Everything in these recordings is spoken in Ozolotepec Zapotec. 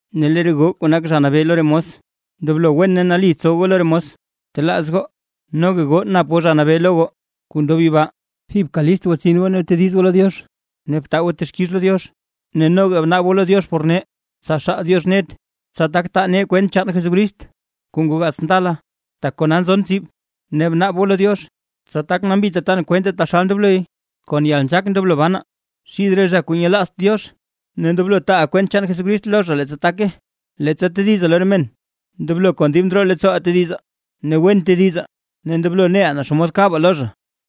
Ne lee re goo zha kuu nak zha kuu nabee lo re mos, ndoblo wen ne nali tsow goo lo re mos goo. Btelaaz goo noga goo nap goo Zha Nabee lo goo kuu ndob yibaa. Thibka list gwatsin goo ne btediz goo lo Diox ne btaa goo texkix lo Diox. Ne noga bnaab goo lo Diox por nee, tsa xaal Diox net, tsa tak taa nee kwent chaan Jesucrist kuu ngoo gaats ndala, tak kona nzon tsib. Ne bnaab goo lo Diox, tsa tak nambita tan kwente taxal ndobloy. Kon yalnzhaak ndoblo banaa xid re zha kuu nyelaazt Diox, ne ndoblo taaʼaa kwent chaan Jesucrist lo zha leettsa take. Leettsa tedizaa lo re men, ndoblo kon dib ndroo leettsooʼaa tedizaa ne wen tedizaa ne ndoblo neʼaa naa xomod kabaa lo zha.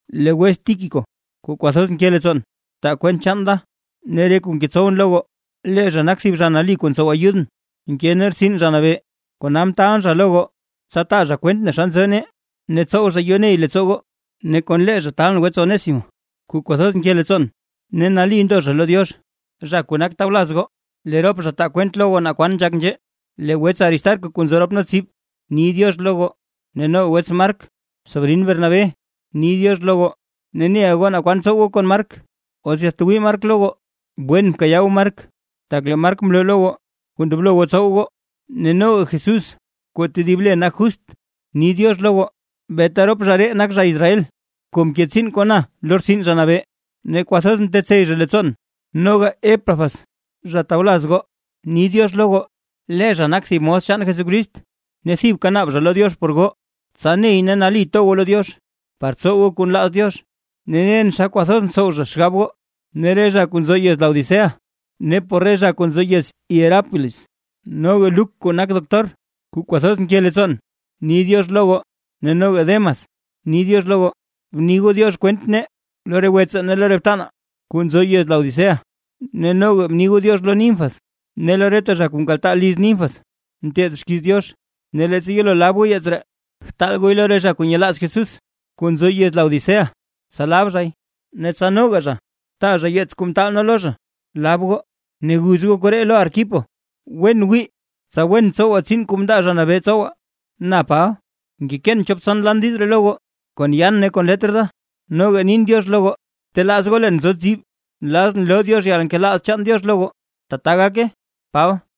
Lee wets Tíquico kuu kwathoz nke leettsoon, taa kwent chaan da ne re kuu ngetsowʼn lo goo. Lee zha nak thib zha nali kuu ntsow ayudʼn nke nee rtsin Zha Nabee. Kona mtaalʼn zha lo goo, tsa taa zha kwent naa xa nzo nee ne tsow zha yoney leettsoo goo. Ne kon lee zha taalʼn wets Onésimo kuu kwathoz nke leettsoon ne nali ndo zha lo Diox, zha kuu nak tawlaz goo. Lee rop zha taa kwent lo goo naa kwan nzhak nzhee. Lee wets Aristarco kuu nzo rop nee tsib ni “diox” lo goo. Ne noga wets Mark sobrin Bernabé ni “diox” lo goo. Ne neʼa goo naa kwan tsow goo kon Mark, os yatwii Mark lo goo, wen bkayaa goo Mark, tak lee Mark mloo lo goo kuu ndoblo goo tsow goo. Ne noga Jesús kuu tedib le nak Justo ni “diox” lo goo. Beeta rop zha ree nak zha Israel kuu mke tsiin kon na lo rtsin Zha Nabee, ne kwathoz mtetsey zha leettsoon. Noga Epafras zha tawlaz goo ni “diox” lo goo. Lee zha nak thib mos chaan Jesucrist ne thibka naab zha lo Diox por goo, tsa ney ne nali to goo lo Diox par tsow goo kuu nlaaz Diox. Ne nen xa kwathoz ntsow zha xgab goo ne re zha kuu nzo yez Laodicea, ne por re zha kuu nzo yez Hierápolis. Noga Luk kuu nak doctor kuu kwathoz nke leettsoon, ni “diox” lo goo, ne noga Demas ni “diox” lo goo. Bni goo “diox” kwent nee lo re wetsaa ne lo re btanaa kuu nzo yez Laodicea. Ne noga bni goo “diox” lo Ninfas, ne lo reta zha kuu nkaltaa liz Ninfas nteed xkiiz Diox. Ne leettsa yelo lab goo yeets ree, btaal gooy lo re zha kuu nyelaaz Jesús kuu nzo yez Laodicea, tsa lab zhay; ne tsa noga zha taa zha yeets kuu mtaalʼn lo zha lab goo. Ne guz goo koree lo Arquipo: “Wen wii tsa wen tsowa tsiin kuu mndaa Zha Nabee tsowa”. Na Paba, ngekeen chop tson lan diiz ree lo goo kon yaan ne kon letr da, noga na nin “diox” lo goo. Btelaaz goo leen nzo tsib. Nlazʼn loo Diox yalnkelaaz chaan Diox lo goo. ¡Tbaa gake! Paba